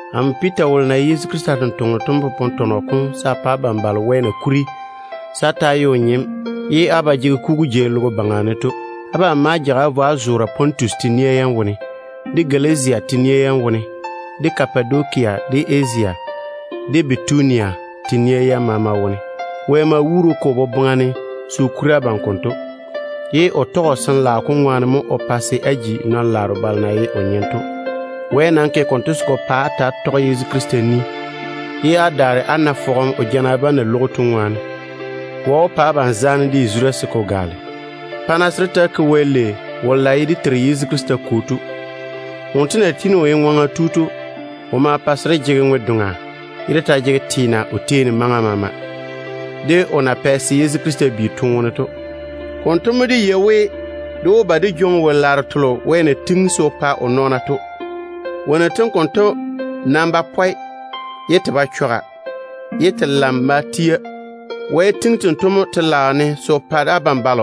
Amo Piita wolo na ye Yezu Krista totoŋa nakwe to mo popone tɔnɔ konto se a pa abam balo Wɛ na kuri se á ta‑á ye o nyem ye á ba jege kugu jei logo baŋa ne to. Abam ma jage á vo á zoore Pontusi, de Galatia, de Kapadokia, de Asia, de Bitunia kateira yam teene wone. Dé Kwo Wɛ ma wuuri o ke o boboŋa ne se o kuri abam konto, ye o tɔge o Sin-laao kom ŋwaane mo o pa se á ji o nyem. Wɛ nam ke konto se ko pa á ta‑á sɛ á pa Yezu Krista, ye á bochare fɔge ya kwɛ o toone jana bam ŋwaane. Wɛ wó pa abam zaane de yazura se ko gaale. Baŋa Wɛ wolo na ye dé Teiru Yezu Krista Kwo to maŋe de teem. Wonto na tiini o ye ŋwaŋa tu to, o ma pa se dé jege ŋwe-doŋa, ye dé ta jege teena o tei ne maŋa maama, o na pɛ se Yezu Krista bi toone wone to ŋwaane. Konto mo dé yei we, dé wó ba dé jwoŋi wo-laaro telo Wɛ na tiŋi se o pa o nɔɔna to. Wonnu tem konto nam ba pɔe, ye te ba chɔga, te nam ba leere de. Wɛ tiŋi tento mo telaao ne se o pa abam.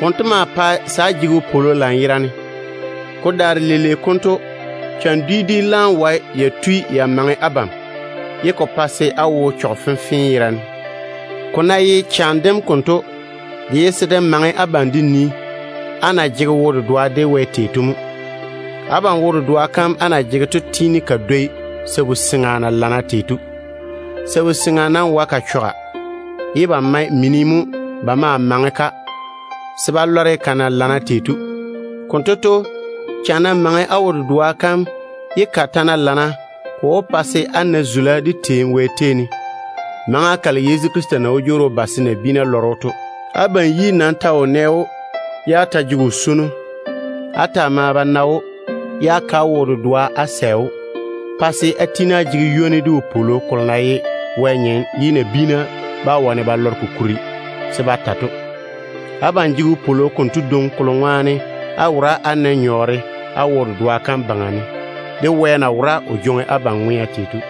Konto maa pae á jege wopwolo lanyerane. Ko daare leile konto, cham dwi dwi wae ya tui ya maŋe abam maŋa fenfee yerane, ye ko pa se á wo chɔge. Ko ná ye cham dem konto, de ye se de maŋe abam de nii á na jege wo-dedoa de Wɛ tei to mo. Abam wo-dedoa kam á na jege to tiini ka dwoi sabu-seŋa na lana tei to. Sabu-seŋa nam wae ka chɔga, ye ba mae mini mo ba ma maŋe-ka se ba lɔre ka na lana tei to. Konto to, cham ná maŋe á wo-dedoa kam, ye ka ta ná lana, ko wó pa se á na zula de teem Wɛ tei ne, maŋa kalo Yezu Krista na wó jwoori o ba se o veere o tete nabiina yiga ne to. Abam yi nam ta wo nɛ‑o, ye á ta jege o swono. Á ta maa ba na‑o, ye á ke á wo-dedoa ded‑o, pa se á tiini á jege ywoni de wopwolo kolo na ye wo-kenkagele ye ko taane bá wane ko ta to. Abam jege wopwolo konto dwoŋi kolo ŋwaane á wora á nae nyɔɔre á wo-dedoa kam baŋa ne, de Wɛ na wora o jwoŋi abam ŋwea tei to.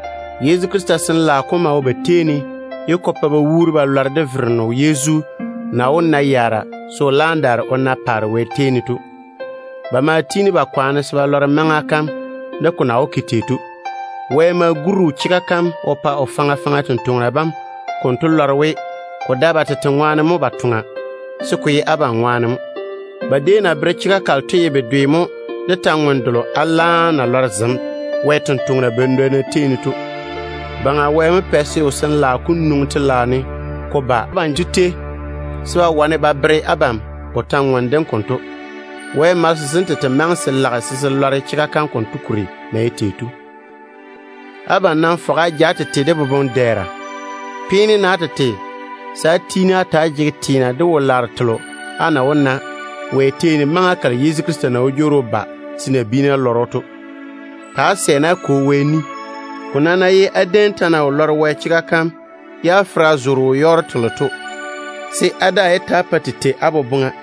Yezu Krista Sin-laao kom maa wo ba tei ne ye ko pa ba wuuri ba lɔre we, Yezu wó ba o na yaara se o laam daare o na paare Wɛ tei ne. Ba maa tiini ba kwaane se ba lɔre maŋa kam konto, de ko na wó ke tei to. Wɛ ma guri o chega kam o pa o sampwori sem konto lɔre we, ko dae ba tete ŋwaane mo ba toŋa, se ko ye abam ŋwaane mo. Ba déem na bere chega kalo to ye bedwe mo de kwor-ywoŋa kalo Wɛ tontoŋena badwonna zem na tɔɔle ba bere abam to. Baŋa Wɛ mo pɛ se o Sin-laao kom nwoŋi telaao ne ko ba banto tei, ye ba wane ba bere abam o kwora kam konto. Wɛ malese sem tete maŋe se lage se se lɔre chega kam konto kuri na ye tei to. Abam nam fɔge á ja á tete de boboŋ-dɛɛra. Peene-na á tete se á tiini á ta‑á jege teena de Wɛ na wó ke zaane delo abam yuu ne maŋa kalo Yezu Krista na wó jwoori o ba se o veere o tete nabiina yiga ne to. Ta‑á sɛ-na á Kwo Wɛ ni. Ko nam ná ye á déem ta na wo lɔre Wɛ chega kam ye á fera zo wo-yɔɔro telo to, se á daa yé pa te taa tei á boboŋa.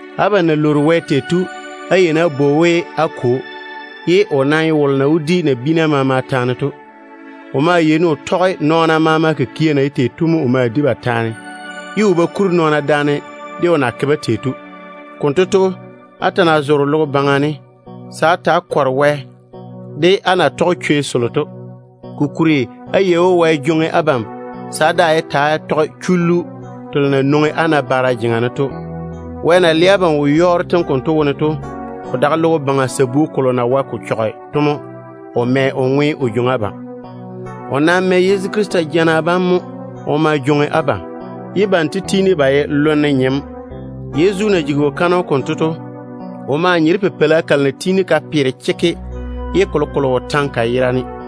Abam na lwoori Wɛ tei to, á yeini á bwoi‑o we á Kwo, ye o nam mo ye wolo na wó di nabiina maama taane to. O maa yeini o tɔge nɔɔna maama kikia na ye tei to o ma di ba taane, ye o ba kuri nɔɔna daane de o na ke-ba tei to. Konto to, á ta ná zoore logo baŋa ne, se á ta‑á kɔre Wɛ de á na tɔge chwei selo to. Kokuri á yei we, Wɛ jwoŋi abam se á daa yé ta‑á tɔge chullu telo na nwoŋi á nabaara jeŋa ne to. Wɛ na le abam wo-yɔɔro tem konto wone to, ko dae logo baŋa sabu kolo na wae ko chɔge to mo o mɛ o ŋwe o jwoŋi abam o yage. O nam mɛ Yezu Krista toone jana bam mo o ma jwoŋi abam, ye banto tiini ba ye lonne nyem. Yezu na jigi wo-kaanem konto to, o maa nye de pipeila kalo na tiini ka lana fase ye kolokolo wo taŋe ka yera ne to mo.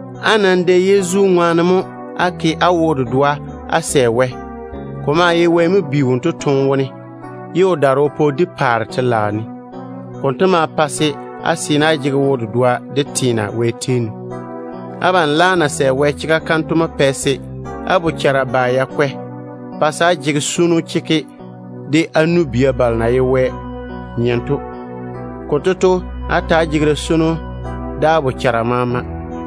Á nam dɛ Yezu ŋwaane mo á ke á wo-dedoa de Wɛ. Ko maa ye Wɛ mo bi wonto toone wone, ye o daare o pa o di paare Wɛ telaao ne. Konto ma pa á seene á jege wo-dedoa de teena Wɛ tei ne. Abam laam na sɛ Wɛ chega kam to mo pɛ á bochara fɔge ya kwɛ, pa se á jege swono chekke de á nu-bia balo de na ye Wɛ nyem to. Konto to, yɔɔre á ta‑á jege da-swono de á bochara maama.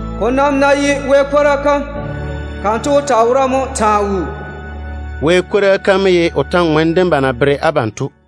Ko nam ná ye Wɛ kwora kam, kanto wó taa wora mo taa wuu.” Kwora kam konto mo ye kwor-ywoŋa kalo ba na tɔɔle ba bere abam to.